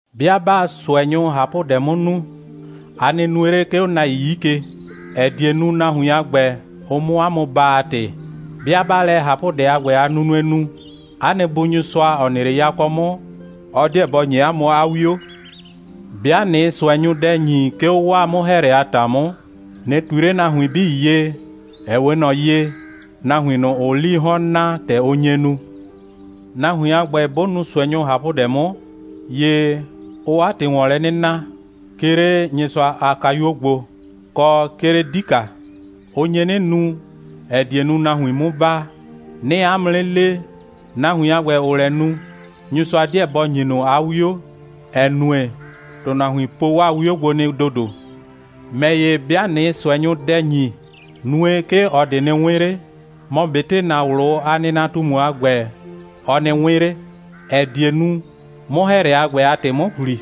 «'Bɩa 'baa ꞊sʋɛnyʋ ꞊hapʋdɛ 'mʋ nu, a nɩ nue 'le, 'ke 'o nahuin 'yi ke, ‑ɛ die nu, nahuin a ‑gbɛ, ʋ 'mʋ 'a mʋ baa a ‑tɩ. 'Bɩa 'baa lɛ ꞊hapʋdɛ a ‑gbɛ a nunue nu, 'a nɩ Bu Nyɩsʋa, ‑ɔ nɩ 'le yakɔ 'mʋ, ɔ 'deɛ bɔ ‑nyi 'a mʋ 'a 'wio. 'Bɩa ꞊nɩɩ ꞊sʋɛnyʋ dɛ ‑nyi, 'ke 'o 'waa 'mʋ‑hɛɛlɛ a ‑ta 'mʋ, ꞊nɩ ꞊tui 'le nahuin 'bii ye, ‑ɛ 'we ꞊nɔ ye, nahuin ꞊nʋ, ‑ʋʋ 'lii 'hɔn naa, ‑tɛ ʋ nye nu. Nahuin a ‑gbɛ, 'bʋ nu ꞊sʋɛnyʋ ꞊hapʋdɛ 'mʋ, ‑ye ʋʋ 'a ‑tɩ ‑wɔn lɛ 'nɩ na, 'ke 'le Nyɩsʋa a kayuo gbo, kɔ, 'ke 'le 'dika. Ʋ nye 'nɩ nu, ‑ɛ die nu, nahuin 'mu baa. 'Nɩɩ 'a mʋ 'nɩ le, nahuin a ‑gbɛ, ‑ʋʋ lɛ nu, Nyɩsʋa 'deɛ bɔ ‑nyi ꞊nʋ 'a 'wio, ‑ɛ nue, ‑tʋnahuin po 'waa 'wio gbo nɩ ‑dodo. ‑Mɛ ‑ye, 'bɩa ꞊nɩɩ ꞊sʋɛnyʋ dɛ ‑nyi, nue, 'ke ꞊ɔ ꞊de nɩ 'wɩn 'le, mɔ ꞊betɩ ‑na ꞊wlʋ a nɩnatumu a ‑gbɛ, ɔ nɩ 'wɩn 'le, ‑ɛ die nu, 'mʋ‑hɛɛlɛ a ‑gbɛ a ‑tɩ 'mʋ ‑hli.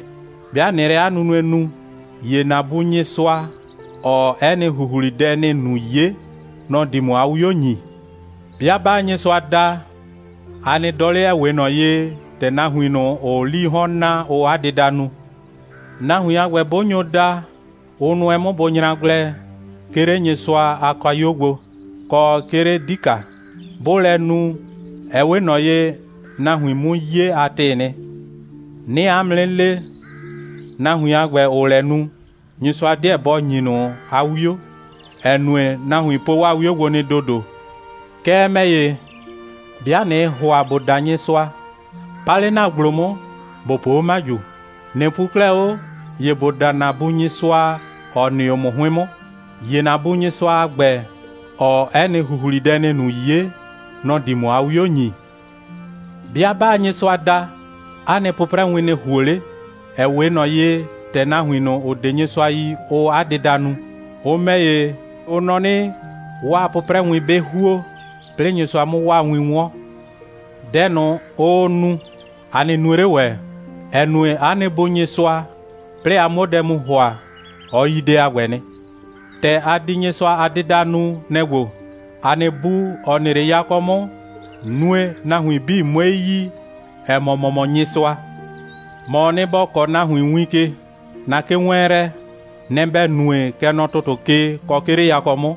'Bɩa ꞊nɩɩ lɛ 'a nunue nu, ‑ye ‑na Bu Nyɩsʋa, ‑ɔɔ 'ɛ nɩ ‑huhlidɛ ‑nɩɩ nu 'ye, nɔ‑ di ‑mʋ 'a 'wio ‑nyi.» «'Bɩa 'baa Nyɩsʋa da, a nɩ dɔ 'le, ‑ɛ 'we ꞊nɔ ye, ‑tɛ nahuin ꞊nʋ, ‑ʋʋ 'lii 'hɔn naa, ʋʋ 'a dɩda nu. Nahuin a ‑gbɛ, 'bʋ nyo da, ʋ nʋɛ 'mʋ bʋ nyra gblɛ, 'ke 'le Nyɩsʋa a kayuo gbo, kɔ 'ke 'le 'dika. 'Bʋʋ lɛ nu, ɛ 'we ꞊nɔ ye, nahuin 'mu 'ye a ‑tɩɩ nɩ. 'Nɩɩ 'a mʋ 'nɩ le, nahuin a ‑gbɛ, ‑ʋʋ lɛ nu, Nyɩsʋa 'deɛ bɔ ‑nyi ꞊nʋ 'a 'wio, ‑ɛ nue, ‑tʋnahuin po 'waa 'wio gbo nɩ ‑dodo. Kɛɛ, ‑mɛ ‑ye, 'bɩa ꞊nɩɩ ‑hʋa ‑bo da Nyɩsʋa, pa 'le ‑na ‑gblo 'mʋ, ‑bo po 'o 'maju. ꞊Nɩ pu 'klɛɛ 'o, ‑ye ‑bo da ‑na Bu Nyɩsʋa, ‑ɔ nɩ 'o ‑mʋ 'hʋɩn 'mʋ. ‑Ye ‑na Bu Nyɩsʋa a ‑gbɛ, ‑ɔɔ 'ɛ nɩ ‑huhlidɛ ‑nɩɩ nu 'ye, nɔ‑ di ‑mʋ 'a 'wio ‑nyi. 'Bɩa 'baa Nyɩsʋa da, 'a nɩ 'pʋprɛwin nɩ ‑huo 'le, ‑ɛ 'we ꞊nɔ ye, ‑tɛ nahuin ꞊nʋ, ‑ʋ 'de Nyɩsʋa yi, ʋʋ 'a dɩda nu. Ʋ ‑mɛ ‑ye, ʋ nɔ 'nɩ, 'waa 'pʋprɛwin 'bɩ ‑huo, 'plɩɩ Nyɩsʋa 'mʋ 'waa win 'wɔn. Dɛ ꞊nʋ, ʋʋ nu, a nɩ nue 'le ‑wɛ, ‑ɛ nue, 'a nɩ Bu Nyɩsʋa, 'plɩɩ a 'muo dɛ mu ‑hʋa, ɔ yi dɛ a ‑gbɛ nɩ. ‑Tɛ a di Nyɩsʋa a dɩda nu, nɛ‑ ‑gbo: ‑A nɩ Bu, ‑ɔ nɩ 'le yakɔ 'mʋ, nue, nahuin 'bii 'mue yi, ‑ɛ mɔ, ‑mɔ mɔ Nyɩsʋa. ‑Mɔɔ nɩ, ‑bɔ kɔɔ nahuin win ke. ‑Na kewɛɛnlɛ, nɛ‑ ‑bɛ nue, kɛ nɔ ‑tʋtʋ ke, kɔ 'ke 'le yakɔ 'mʋ.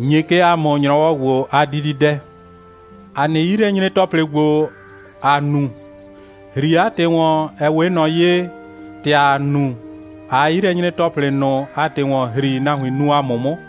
‑Nye kɛ ‑a mʋ ‑nyrɔwɔ ‑gbo a dididɛ. ‑A nɩ 'yilɛnyre‑tɔplɩ ‑gbo, ‑a nu, ‑hri 'a ‑tɩ ‑wɔn, ‑ɛ 'we ꞊nɔ ye, ‑tɛ ‑aa nu, ꞊aa 'yilɛnyre‑tɔplɩ ꞊nʋ a ‑tɩ ‑wɔn ‑hri, nahuin nu ‑a mʋ 'mʋ.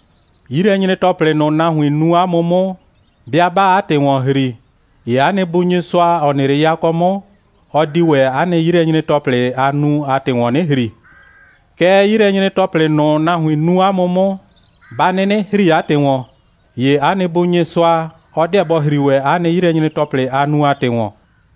'Yilɛnyre‑tɔplɩ ꞊nʋ, nahuin nu 'a mʋ 'mʋ, 'bɩa 'baa 'a ‑tɩ ‑wɔn ‑hri, ‑ye 'a nɩ Bu Nyɩsʋa, ‑ɔ nɩ 'le yakɔ 'mʋ, ɔ di ‑wɛ 'a nɩ 'yilɛnyre‑tɔplɩ, a nu a ‑tɩ ‑wɔn 'nɩ ‑hri. Kɛɛ, 'yilɛnyre‑tɔplɩ ꞊nʋ, nahuin nu 'a mʋ 'mʋ, 'ba 'nɩnɩ ‑hri 'a ‑tɩ ‑wɔn, ‑ye 'a nɩ Bu Nyɩsʋa, ɔ 'deɛ bɔ ‑hri ‑wɛ 'a nɩ 'yilɛnyre‑tɔplɩ, a nu a ‑tɩ ‑wɔn.»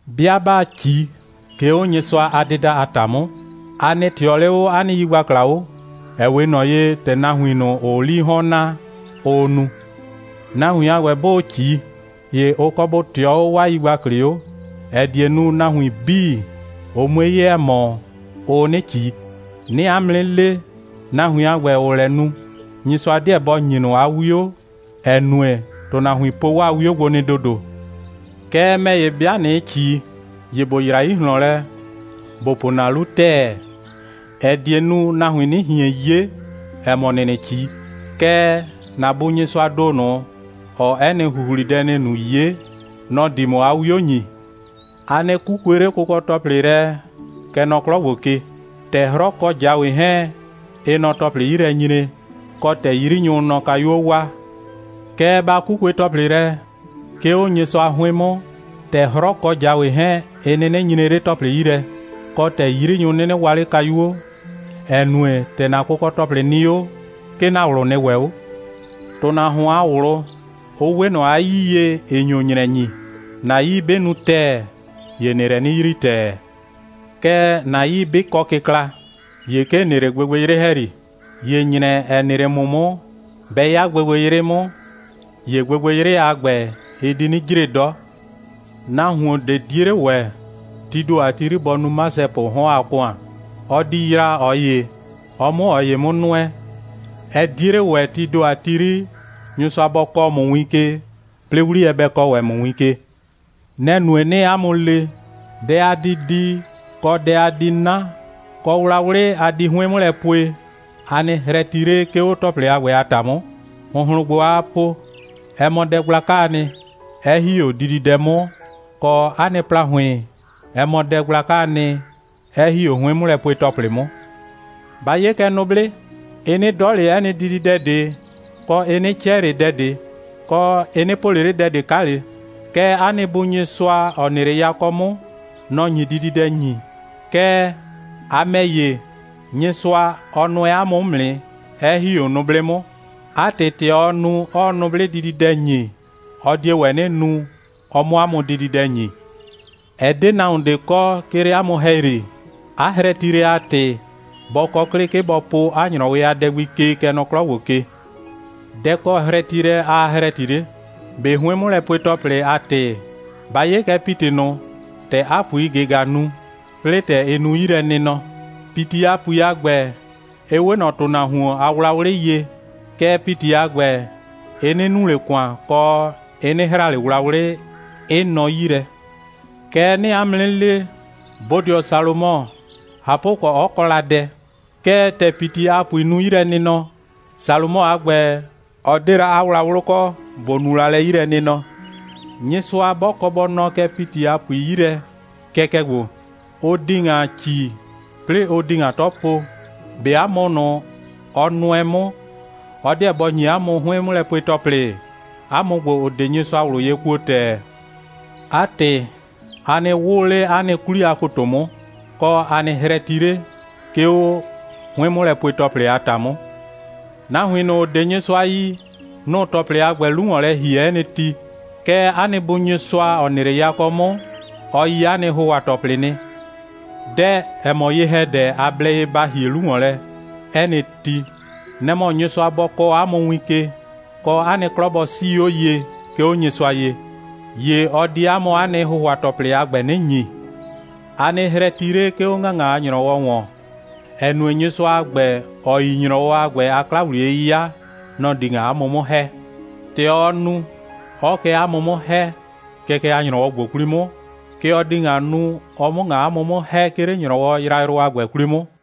«'Bɩa 'baa ꞊ci, ('ke 'o Nyɩsʋa a dɩda a ‑ta 'mʋ,) a nɩ ꞊tɩɔ 'le 'o 'a nɩ yigbakla 'o, ‑ɛ 'we ꞊nɔ ye, ‑tɛ nahuin ꞊nʋ, ‑ʋʋ 'lii 'hɔn naa, ʋʋ nu. Nahuin a ‑gbɛ, 'bʋʋ ꞊ci, ‑ye ʋ kɔ bʋ ꞊tɩɔ 'o 'waa yigbaklɩ 'o, ‑ɛ die nu, nahuin 'bii, ʋ 'mue 'ye, ‑ɛ mɔ, ʋʋ 'nɩ ꞊ci. 'Nɩɩ 'a mʋ 'nɩ le, nahuin a ‑gbɛ, ‑ʋʋ lɛ nu, Nyɩsʋa 'deɛ bɔ ‑nyi ꞊nʋ 'a 'wio, ‑ɛ nue, ‑tʋnahuin po 'waa 'wio gbo nɩ ‑dodo. Kɛɛ, ‑mɛ ‑ye, 'bɩa ꞊nɩɩ ꞊ci, ‑ye ‑bo yra 'yi ꞊hlɔn lɛ, ‑bo po ‑na 'lu ‑tɛɛ, ‑ɛ die nu, nahuin 'nɩ ꞊hien 'ye, ‑ɛ mɔ, ‑nɩɩ 'nɩ ꞊ci. Kɛɛ, ‑na Bu Nyɩsʋaa ‑do ꞊nʋ, ‑ɔɔ 'ɛ nɩ ‑huhlidɛ ‑nɩɩ nu 'ye, nɔ‑ di ‑mʋ 'a 'wio ‑nyi.» «A nɩ 'kukue 'le kʋkɔ‑tɔplɩ lɛ, kɛ nɔ 'klɔ ‑gbo ke, ‑tɛ 'hrɔ kɔ ꞊jawe 'hɛɛn, ɩɩ nɔ ‑tɔplɩ 'yi lɛ nyree, kɔ, ‑tɛ 'yrinyʋʋ nɔ kayuo waa. Kɛɛ, ba 'kukue kʋkɔ‑tɔplɩ lɛ, 'ke 'o Nyɩsʋa 'hʋɩn 'mʋ, ‑tɛ 'hrɔ kɔ ꞊jawe 'hɛɛn, ɩ 'nɩnɩ nyree 'le ‑tɔplɩ 'yi lɛ, kɔ, ‑tɛ 'yrinyʋ 'nɩnɩ waa 'le kayuo, ‑ɛ nue, ‑tɛ ‑na kʋkɔ‑tɔplɩ nɩ 'o, 'ke ‑na ꞊wlʋ nɩ ‑wɛ 'o.» «‑Tʋnahuon a ꞊wlʋ, ʋ 'we ꞊nɔ 'a 'yii ye, ‑ɩ nyo ‑nyrɛ ‑nyi. ‑Na 'yii 'bɩ nu ‑tɛɛ, ‑ye ‑nɩɩ lɛ 'nɩ yrii ‑tɛɛ. Kɛɛ, ‑na 'yii 'bɩ kɔ kɩkla, ‑ye 'ke ‑n nɩ 'le gbɩgbɩyrɩ ‑hɛyri. ‑Ye ‑nyrɛ, ‑ɛ nɩ 'le ‑mʋ 'mʋ, 'bɛ 'ya gbɩgbɩyrɩ 'mʋ, ‑ye gbɩgbɩyrɩ a ‑gbɛ, ɩ di 'nɩ jre 'dɔ.» «Nahuon ꞊de 'die 'le ‑wɛ, tii ‑do 'yri, bɔ nu 'masɛpʋʋ 'hɔn a ‑kʋan. Ɔ di yraa ꞊ɔ ‑ye, ɔ 'mʋ ꞊ɔ ‑ye 'mʋ nʋɛ. Ɛ 'die 'le ‑wɛ, tii ‑do 'yri, Nyɩsʋa bɔ kɔɔ ‑mʋ win ke, 'plɩɩ 'wliyɛ bɛ kɔɔ ‑wɛ ‑mʋ win ke.» «Nɛ‑ nue, 'nɩɩ 'a mʋ le: Dɛ a di di, kɔ, dɛ a di 'na, kɔ, wlawlɩ a di 'hʋɩn 'mʋ lɛ pue, a nɩ hrɛti 'le, 'ke 'o ‑tɔplɩ a ‑gbɛ a ‑ta 'mʋ. ‑Hʋnhlʋn ‑gbo, aa po, ɛ mɔ dɛ gblakaa nɩ, 'ɛ ‑hi 'o dididɛ 'mʋ, kɔ, 'a nɩ ‑plahʋɩn, ɛ mɔ dɛ gblakaa nɩ, 'ɛ ‑hi 'o 'hʋɩn'mʋlɛpue‑tɔplɩ 'mʋ. Ba 'ye kɛ nʋblɩ. Ɩ 'nɩ 'dɔ ꞊le 'ɛ nɩ dididɛ ꞊de, kɔ, ɩ 'nɩ 'cɛ ꞊le dɛ ꞊de, kɔ, ɩ 'nɩ po ꞊le 'le dɛ ꞊de 'kale. Kɛɛ, 'a nɩ Bu Nyɩsʋa, ‑ɔ nɩ 'le yakɔ 'mʋ, nɔ‑ nyi dididɛ ‑nyi. Kɛɛ, a ‑mɛ ‑ye, Nyɩsʋa, ɔ nʋɛ 'a mʋ 'mʋ nɩ, 'ɛ ‑hi 'o nʋblɩ 'mʋ. 'A ‑tɩ, ‑tɛ ɔɔ nu, 'ɔɔ nʋblɩ dididɛ ‑nyi, ɔ die ‑wɛ 'nɩ nu, ɔ 'mʋ 'a mʋ dididɛ ‑nyi. Ɛ 'de nahuon ꞊de kɔ, 'ke 'le 'a mʋ ‑hɛyri, 'a hrɛtilɛ a ‑tɩ, ‑bɔ kɔ 'klɩ, 'ke ‑bɔ po 'a ‑nyrɔwɩ a dɛ gbi ke, kɛ nɔ 'klɔ ‑gbo ke. Dɛ‑ kɔ hrɛtilɛ aa hrɛti 'le? ꞊Be 'hʋɩn'mʋlɛpue‑tɔplɩ a ‑tɩ? Ba 'ye kɛ ‑piti ꞊nʋ, ‑tɛ 'a ‑puii ꞊gɩga nu, 'plɩɩ, ‑tɛ ɩ nu 'yilɛnɩnɔ. ‑Piti a ‑pui a ‑gbɛ, ɩ 'we ꞊nɔ ‑tʋnahuon a wlawlɩ ye. Kɛɛ, ‑piti a ‑gbɛ, ɩ 'nɩ nu ꞊le ‑kʋan, kɔ, ɩ 'nɩ hra ꞊le wlawlɩ, 'ɩ nɔ 'yi lɛ. Kɛɛ ‑ye 'nɩɩ 'a mʋ 'nɩ le, bodɩɔ Salomɔ, ꞊hapʋkɔ, 'ɔ kɔ la dɛ, kɛɛ, ‑tɛ ‑piti a ‑pui nu 'yilɛnɩnɔ, Salomɔ a ‑gbɛ, ɔ 'de la 'a wlawlʋ kɔ, ‑bʋ nu la lɛ 'yilɛnɩnɔ. Nyɩsʋa 'bɔ kɔ bɔ nɔɔ kɛ ‑piti a ‑pui 'yi lɛ kɛkɛ ‑gbo, ʋ di ‑ŋa ‑ci, 'plɩɩ ʋ di ‑ŋa 'tɔ po, ꞊be 'a mʋ ꞊nʋ, ɔ nʋɛ 'mʋ, ɔ 'deɛ bɔ ‑nyi 'a mʋ 'hʋɩn'mʋlɛpue‑tɔplɩ? 'A mʋ ‑gbo, ‑ʋ 'de Nyɩsʋa ꞊wlʋ ye kuo ‑tɛɛ. 'A ‑tɩ, a nɩ 'wʋʋ 'le 'a nɩ 'kwli a ‑koto 'mʋ, kɔ, a nɩ hrɛti 'le, 'ke 'o 'hʋɩn'mʋlɛpue‑tɔplɩ a ‑ta 'mʋ. Nahuin ꞊nʋ, ‑ʋ 'de Nyɩsʋa yi, nʋ‑ʋ ‑tɔplɩdʋ a ‑gbɛ 'lu ‑wɔn lɛ ‑hie 'ɛ nɩ ti. Kɛɛ, 'a nɩ Bu Nyɩsʋa, ‑ɔ nɩ 'le yakɔ 'mʋ, ɔ yi 'a nɩ ‑hʋhʋa‑tɔplɩ nɩ. Dɛ, ‑ɛ mɔ ye‑hɛdɛ, a blɛ ye ba ‑hie 'lu ‑wɔn lɛ 'ɛ nɩ ti, nɛ‑ mɔ Nyɩsʋa bɔ kɔɔ 'a mʋ win ke, kɔ, 'a nɩ 'klɔ bɔ 'sii 'o ye, 'ke 'o Nyɩsʋa ye, ‑ye ɔ di 'a mʋ 'a nɩ ‑hʋhʋa‑tɔplɩ a ‑gbɛ 'nɩ ‑nyi. A nɩ hrɛti 'le, 'ke 'o ‑ŋaŋa a ‑nyrɔwɔ ‑wɔn, ‑ɛ nue, Nyɩsʋa a ‑gbɛ, ‑ɔ yi ‑nyrɔwɔ a ‑gbɛ a 'kla‑wliye'yɩya, nɔ‑ di ‑ŋa 'a mʋ 'mʋ ‑hɛ. ‑Tɛ ɔɔ nu, 'ɔɔ kɛ 'a mʋ 'mʋ ‑hɛ, kɛkɛ a ‑nyrɔwɔ ‑gbo 'kwli 'mʋ, kɛ ɔ di ‑ŋa nu, ɔ 'mʋ ‑ŋa 'a mʋ 'mʋ ‑hɛ, 'ke 'le ‑nyrɔwɔ yrayrʋ a ‑gbɛ 'kwli 'mʋ.»